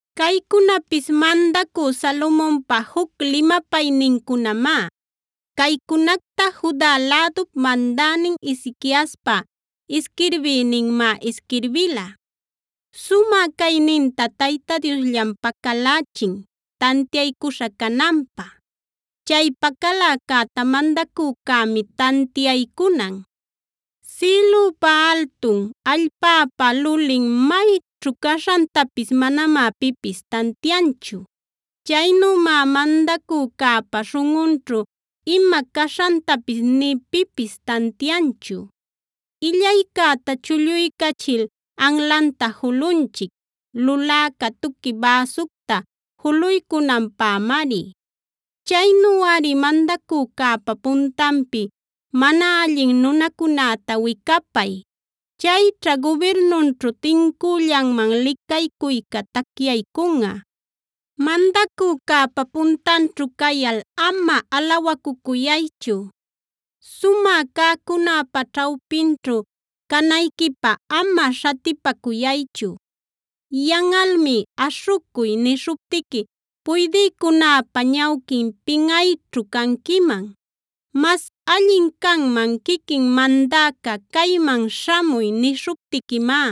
Caycunapis mandacü Salomonpa juc limapaynincunamá. Caycunacta Juda lädup mandänin Ezequiaspa isquirbïninmá isquirbila: Sumä cayninta Tayta Diosllam pacalächin tantiaycuśha cananpä. Chay pacaläcäta mandacücämi tantiaycunan. Sïlüpa altun, allpäpa lulin mayćhu caśhantapis manamá pipis tantianchu. Chaynümá mandacücäpa śhunꞌunćhu ima caśhantapis nï pipis tantianchu. Illaycäta chulluycachil anlanta julunchic, luläca tuqui bäsucta juluycunanpämari. Chaynuꞌari mandacücäpa puntanpi mana allin nunacunäta wicapay; chayćha gubirnunćhu tincüllanman licaycuyca tacyaycunꞌa. Mandacücäpa puntanćhu cayal ama alawacucuyaychu; sumä cäcunäpa ćhawpinćhu canayquipä ama śhatipacuychu. Yanꞌalmi “aśhucuy” nishuptiqui puydïcunäpa ñawquin pinꞌayćhu canquiman. Mas allin canman quiquin mandäca: “Cayman śhamuy” nishuptiquimá.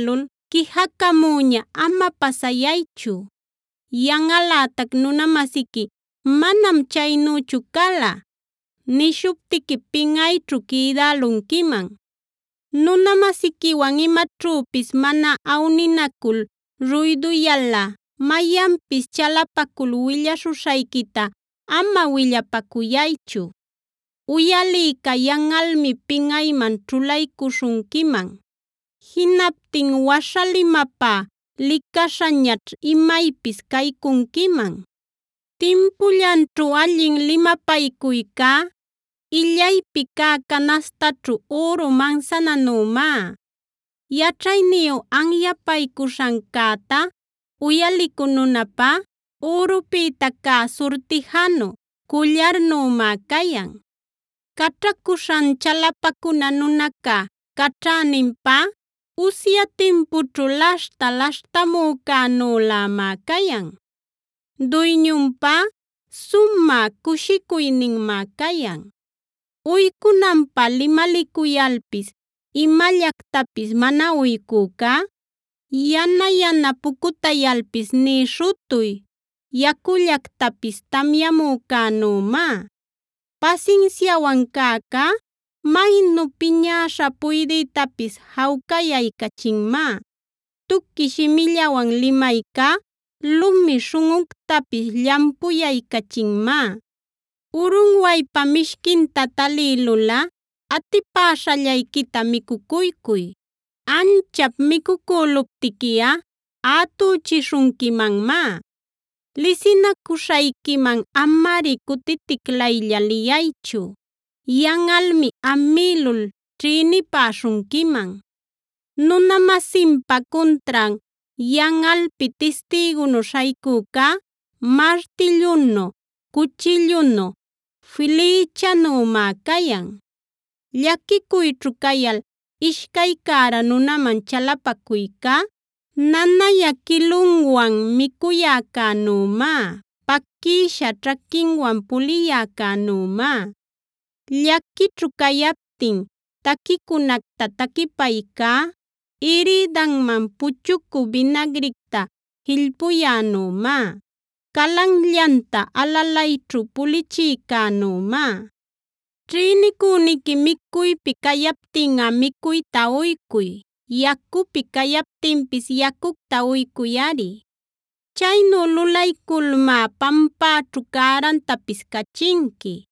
quijacamüña ama pasayaychu. Yanꞌalätac nuna-masiqui “manam chaynüchu cala” nishuptiqui pinꞌayćhu quïdälunquiman. Nuna-masiquiwan imaćhüpis mana awninacul ruyduyalꞌa, mayanpis chalapacul willaśhuśhayquita ama willapacuyaychu. Uyalïca yanꞌalmi pinꞌayman ćhulaycuśhunquiman; jinaptin waśhalimapä licaśhañaćh imaypis caycunquiman. Timpullanćhu allin limapaycuycá, illaypi cä canaśhtaćhu üru mansananümá. Yaćhayniyu anyapaycuśhancäta uyalicü nunapá ürupïta cä surtijanu, cullarnümá cayan. Caćhacuśhan chalapacuna nunaca caćhäninpá, usya timpućhu laśhta laśhtamücänülämá cayan. Duyñunpä sumä cushicuyninmá cayan. Uycunanpä limalicuyalpis imallactapis mana uycücá, yana-yana pucutayalpis nï śhutuy yacullactapis tamyamücänümá. Pasinsiawan cäcá maynu piñäśha puydïtapis jawcayaycachinmá; tuqui shimillawan limaycá lumi śhunꞌuctapis llampuyaycachinmá. Urunwaypa mishquinta talïlulꞌa atipäśhallayquita micucuycuy; anchap micucüluptiquiꞌa ätüchishunquimanmá. Lisinacuśhayquiman amari cutiticlaylla liyaychu; yanꞌalmi amïlul ćhïnipäśhunquiman. Nuna-masinpa cuntran yanꞌalpi tistïgunu śhaycücá, martillunu, cuchillunu, flïchänümá cayan. Llaquicuyćhu cayal ishcay cära nunaman chalapacuyca, nanayä quilunwan micuyäcänümá, paquïsha ćhaquinwan puliyäcänümá. Llaquićhu cayaptin taquicunacta taquipaycá, irïdanman puchucü binagricta jillpuyänümá, calanllanta alalayćhu pulichïcänümá. Ćhïnicüniqui micuypi cayaptinꞌa micuyta uycuy; yacupi cayaptinpis yacucta uycuyꞌari. Chaynu lulayculmá pampäćhu cärantapis cachinqui.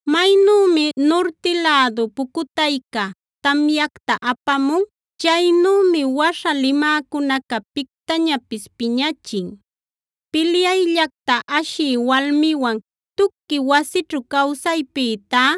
Maynümi nurti lädu pucutayca tamyacta apamun, chaynümi waśha limäcunaca pictañapis piñachin. Pilyayllacta ashï walmiwan tuqui wasićhu cawsaypïtá,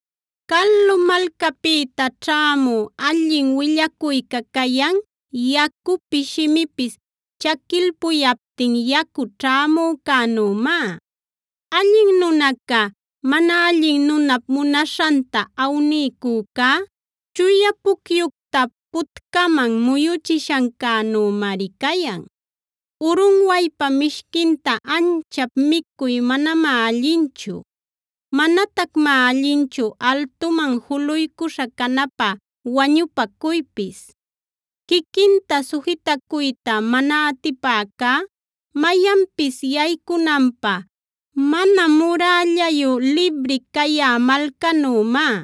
Calu malcapïta ćhämü allin willacuyca cayan, yacupi shimipis chaquilpuyaptin yacu ćhämücänümá. Allin nunaca, mana allin nunap munaśhanta awniycücá, chuya pucyucta putcaman muyuchishancänümari cayan. Urunwaypa mishquinta anchap micuy manamá allinchu; manatacmá allinchu altuman juluycuśha canapä wañupacuypis. Quiquinta sujitacuyta mana atipäcá, mayanpis yaycunanpä mana murällayu libri cayä malcanümá.